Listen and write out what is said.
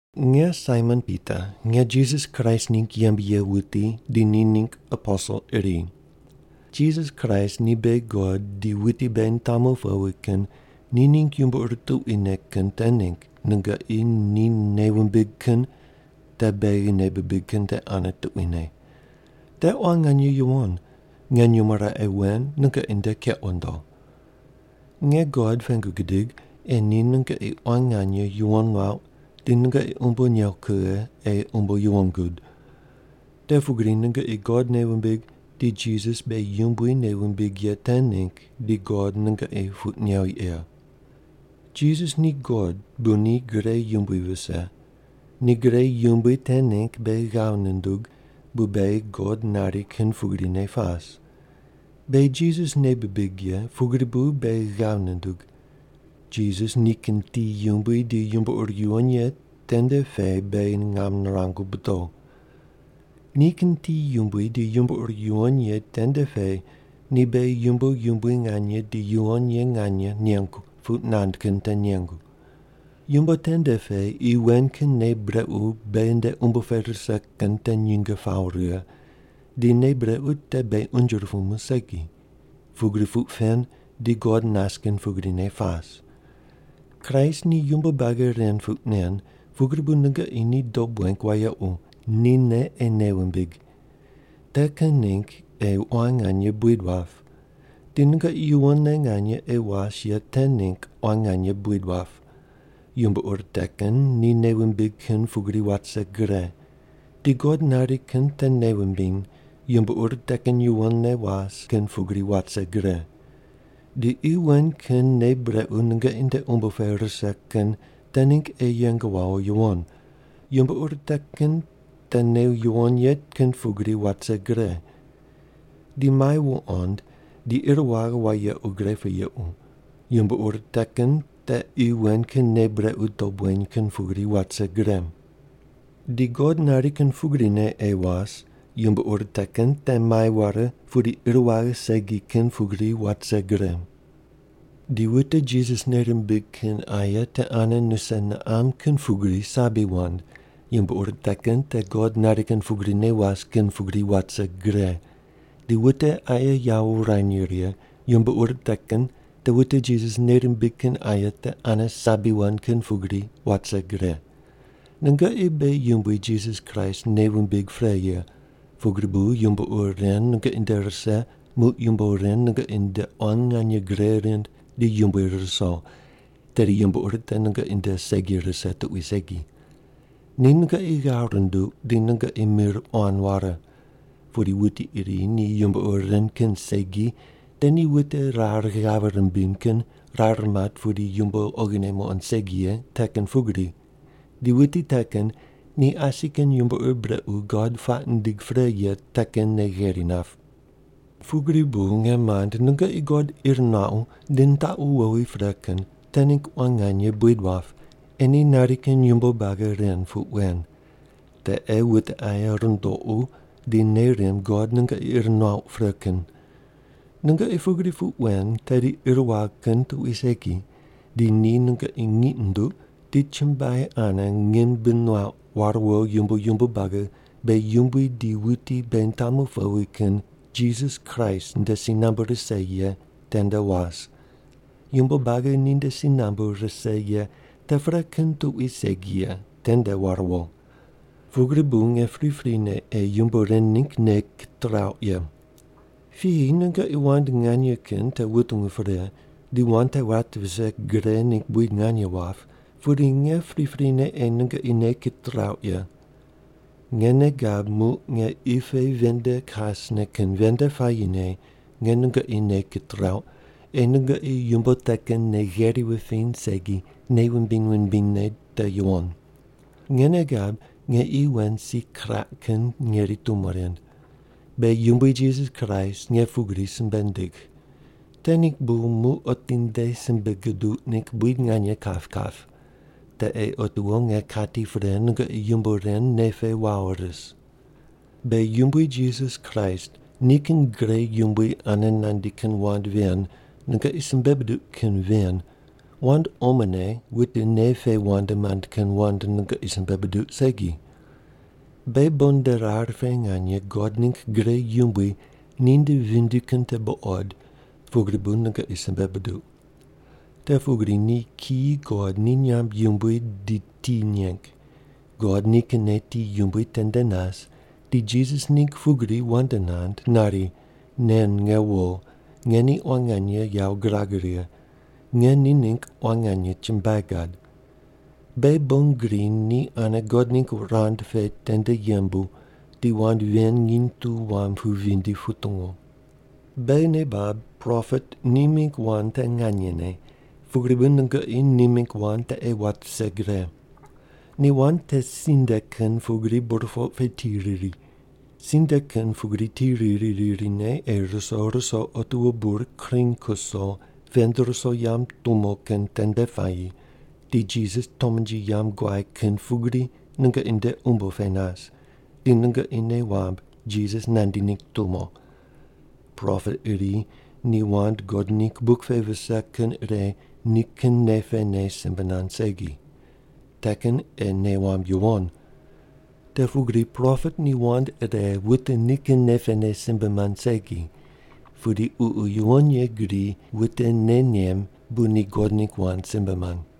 Nge Saimon Pita, nge Jisas Kraist ningg yembe ye wuti di ni ningg aposel iri. Jisas Kraist ni beghi God di wuti beghi nitamu powi kin ni ningg yumbo ur tuquine kin te ningg nungoqi ni nei wumbig kin te beghi nei bibig kin te ane tuquine. Te quan nganye yuwon. Nge nyumo raqe wen nungoqi nde keq wundo. Nge God pengu gidig ei ni nungoqi quan nganye yuwon nuauq di nungoqi umbo neuq kughe ei umbo yuwon gud. Te pugri nungoqi God nei wumbig di Jisas beghi Yumbui nei wumbig ye te ningg di God nungoqi puq neuq ye. Jisas ni God bu ni gre yumbui vise. Ni gre yumbui te ningg beghi ghav nundug, bu beghi God nari kin pugrine pas. Beghi Jisas nei bibig ye, pugri bu beghi ghav nundug. Jisas nikin ti yumbui di yumbo ur yuwon ye tende pe beghi ngam nirangu bodo. Nikin ti yumbui di yumbo ur yuwon ye tende pe ni beghi yumbo yumbui nganye di yuwon ye nganye nengu puq nand kin te nengu. Yumbo tende pe qi wen kin nei brequ beghi nde umbo pe rise kin te nyinge pawo righe, di nei brequ te beghi unje rupumu segi. Pugri puq pen, di God nas kin pugrine pas. Kraist ni yumbo buagi ren puq nen, pugri bu nungoqi ni dob weng wayequ, nine ei nei wumbig. Te kin ningg ei quan nganye buid wap. Di nungoqi yuwonne nganye ei was ye te ningg quan nganye buid wap. Yumbo ur te kin ni nei wumbig kin pugri wat rise gre. Di God nari kin te nei wumbiny, yumbo ur te kin yuwonne was kin pugri wat rise gre. Di qi wen kin nei brequ nungoqi nde umbo pe rise kin te ningg ei yeng wawo yuwon, yumbo ur te kin te nei yuwon ye kin pugri wat rise gre. Di mai wuqond di ir waghe wayequ gre pu yequ, yumbo ur te kin te qi wen kin nei brequ dob weny kin pugri wat rise gre. Di God nari kin pugrine ei was, yumbo ur te kin te mai ware pudi ir waghe segi kin pugri wat rise gre. Di wute Jisas nei rimbig kin aye te ane nuse niqam kin pugri sabi wand, yumbo ur te kin te God nari kin pugrine was kin pugri wat rise gre. Di wute aye yawo wurany righe, yumbo ur te kin te wute Jisas nei rimbig kin aye te ane sabi wand kin pugri wat rise gre. Nungoqi beghi Yumbui Jisas Kraist nei wumbig pre ye. Pugri bu yumbo ur ren nungoqi nde rise muq yumbo ren nungoqi nde quan nganye gre rind di yumbui ruso, tedi yumbo ur te nungoqi nde segi rise tuqui segi. Ni nungoqi ghav runduq di nungoqi mir quan ware. Pudi wuti iri ni yumbo ur ren kin segi te ni wute rar ghave rimbim kin rar mat pudi yumbo oghine muqond segi ye te kin pugri. Di wuti te kin ni asi kin yumbo ur brequ God puaq nindig pre ye te kin nei gheri nap. Pugri bu, nge mand, nungoqi God ir nuaqu di nitaqu wowi pre kin te ningg quan nganye buid wap, ei ni nari kin yumbo buagi ren puq wen. Te ei wute aye rundoqu di nei rimb God nungoqi ir nuaqu pre kin. Nungoqi pugri puq wen, tedi ir waghe kin tuqui segi, di ni nungoqi ngiq nunduq, di chumbuai ane ngim bi nuauq war wo yumbo yumbo buagi beghi Yumbui di wuti beghi nitamu powi kin Jisas Kraist nde si nambu rise ye tende was. Yumbo buagi ninde si nambu rise ye te pre kin tuqui segi ye tende war wo. Pugri bu nge priprine ei yumbo ren ningg nei kitrauq ye. Piyi nungoqi wand nganye kin te wutungu pre di wand te wat vise gre ningg buid nganye wap, pudi nge priprine ei nungoqi nei kitrauq ye. Nge nei gab muq nge qi pe ven nde kasne kin ven nde puayine nge nungoqi nei kitrauq, ei nungoqi yumbo te kin nei gheri wupiny segi nei wumbiny wumbinyne, te yuwon. Nge nei gab nge qi wen si kiraq kin ngeri tumo rind. Beghi Yumbui Jisas Kraist nge pugri simbe nindigh. Te ningg bu muq otinde simbe guduq ningg buid nganye kap kap. Te ei otiwo nge kati pre nungoqi yumbo ren nei pe wawo ris. Beghi Yumbui Jisas Kraist nikin gre yumbui ane nandi kin wand ven nungoqi simbe buduq kin ven wand omone wute nei pe wand mand kin wand nungoqi simbe buduq segi. Beghi bon nde rar pe nganye God ningg gre yumbui ninde vindi kin te buqod, pugri bu nungoqi simbe buduq. Te pugri ni kiyi God ni nyamb yumbui di ti neng. God nikinne ti yumbui tende nas, di Jisas ningg pugri wand nand nari, “Nen nge wo, nge ni quan nganye yawo girag righe. Nge ni ningg quan nganye chumbuai gad.” Beghi bon gri ni ane God ningg rand pe tende yembu, di wand ven nginy tu wam pu vindi putungu. Beghi nei bab propet ni mingg wand te nganyene, pugri bu nungoqi ni mingg wand te ei wat vise gre. Ni wand te sinde kin pugri burpoq pe ti riri. Sinde kin pugri ti riri ririne ei ruso ruso otiwo bur kring kuso pend ruso yamb tumo kin tende puayi di Jisas tomnji yamb guay kin pugri nungoqi nde umbo pe nas di nungoqi nei wamb Jisas nandi ningg tumo. Propet iri ni wand God ningg buk pe vise kin ire nikin nei pene simbe nand segi. Te kin ei nei wamb yuwon. Te pugri propet ni wand ire wute nikin nei pene simbe mand segi, pudi Ququ Yuwon Ye gri wute nei nem bu ni God ningg wand simbe mand.